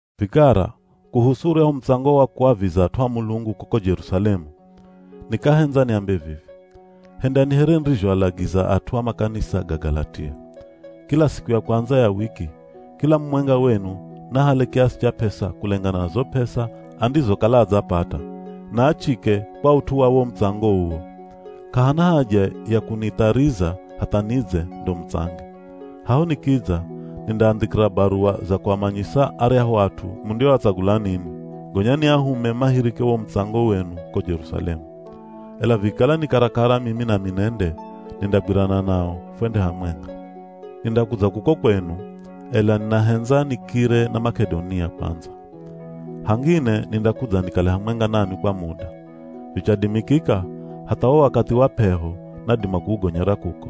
Vikara, kuhusu uryahu mutsango wa kuaviza at'u a Mulungu kuko Jerusalemu, nikahendza niambe vivi: hendani here nirizhoalagiza at'u a makanisa ga Galatia. Kila siku ya kwandza ya wiki, kila mumwenga wenu naahale kiasi cha p'esa kulengana na zo p'esa andizokala adzapata, na achike kwa ut'u wa wo mutsango uwo. K'ahana haja ya kunithariza hatha nidze ndo mutsange. Haho nikidza, nindaandhikira baruwa za kuamanyisa aryahu at'u mundioatsagula ninwi, gonya niahume mahirike wo mutsango wenu ko Jerusalemu. Ela vikikala ni karakara mimi nami nende, nindagwirana nao fwende hamwenga. Nindakudza kuko kwenu, ela ninahendza nikire na Mak'edonia kwandza. Hangine nindakudza nikale hamwenga nanwi kwa muda. Vichadimikika hatha wo wakathi wa p'eho nadima kuugonyera kuko,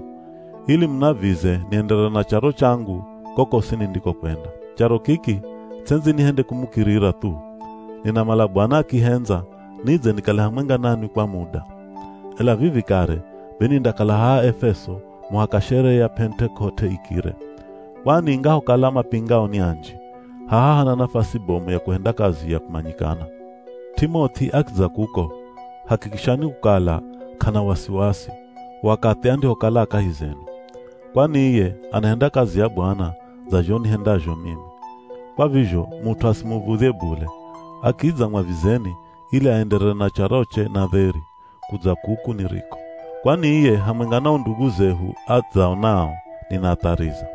ili munavize nienderere na charo changu, kokosi nindikokwenda. Charo kiki ts'endzi nihende kumukirira thu. Ninamala Bwana akihendza nidze nikale hamwenga nanwi kwa muda. Ela vivi kare be nindakala haha Efeso muhaka sherehe ya Pentekote ikire. Kwani ingahokala mapingao ni anji, haha hana nafasi bomu ya kuhenda kazi ya kumanyikana. T'imoth'i akidza kuko, hakikishani kukala k'ana wasiwasi, wakathi andihokala a kahi zenu. Kwani iye anahenda kazi ya Bwana dza zho nihendazho mimi. Kwa vizho mut'u asimuv̱udhye bule, akidza mwavizeni ili aenderere na charoche na dheri, kudza kuku niriko. Kwani iye hamwenga na o ndugu zehu adzao nao, ninaathariza.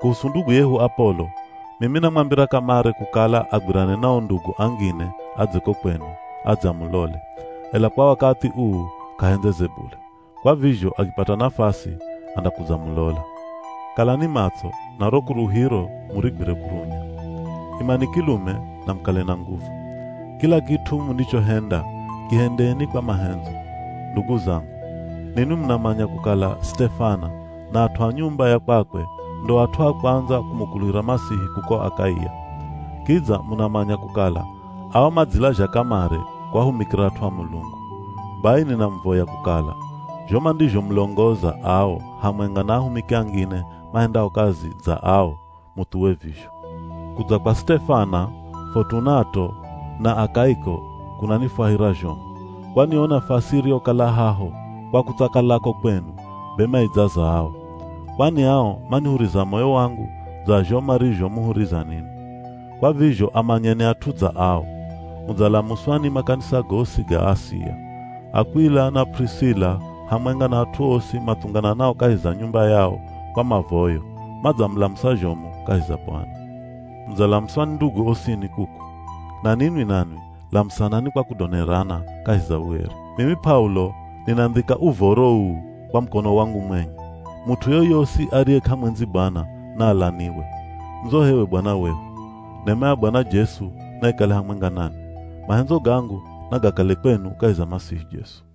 Kuhusu ndugu yehu Apolo, mimi namwambira kamare kukala agwirane na o ndugu angine adze ko kwenu adze amulole, ela kwa wakathi uu k'ahendzeze bule. Kwa vizho akipata nafasi, andakudzamulola. Kalani matso, na ro kuluhiro murigwire kurunya. Imani kilume, na mukale na nguvu. Kila kit'u mundichohenda kihendeni kwa mahendzo. Ndugu zangu, ninwi munamanya kukala Sitefana na at'u a nyumba ya kwakwe ndo at'u a kwandza kumukuluhira Masihi kuko Akaia. Kidza munamanya kukala ao madzilazha kamare kuahumikira at'u a Mulungu. Bai ninamuvoya kukala, zho mandizhomulongoza ao hamwenga na ahumiki angine mahendao kazi dza ao, muthuwe vizho. Kudza kwa Sitefana, Fotunato, na Akaiko kunanifwahira zhomu, kwani yo nafasi iriyokala haho kwa kutsakalako kwenu be maidzaza ao. Kwani ao manihuriza moyo wangu dza zho marizhomuhuriza ninwi. Kwa vizho amanyeni at'u dza ao. Mudzalamuswa ni makanisa gosi ga Asia. Akw'ila na P'urisila, hamwenga na at'u osi mathungananao kahi za nyumba yao kwa mavoyo, madzamulamusa zhomu kahi za Bwana. Mudzalamuswa ni ndugu osini kuku. Na ninwi nanwi lamusanani kwa kudonerana kahi za ueri. Mimi P'aulo ninandhika uvoro uu kwa mukono wangu mwenye. Mut'u yoyosi ariye k'amwendzi Bwana, naalaniwe. Ndzo h'ewe Bwana wehu. Nema ya Bwana Jesu naikale hamwenga nanwi. Mahendzo gangu nagakale kwenu kahi za Masihi Jesu.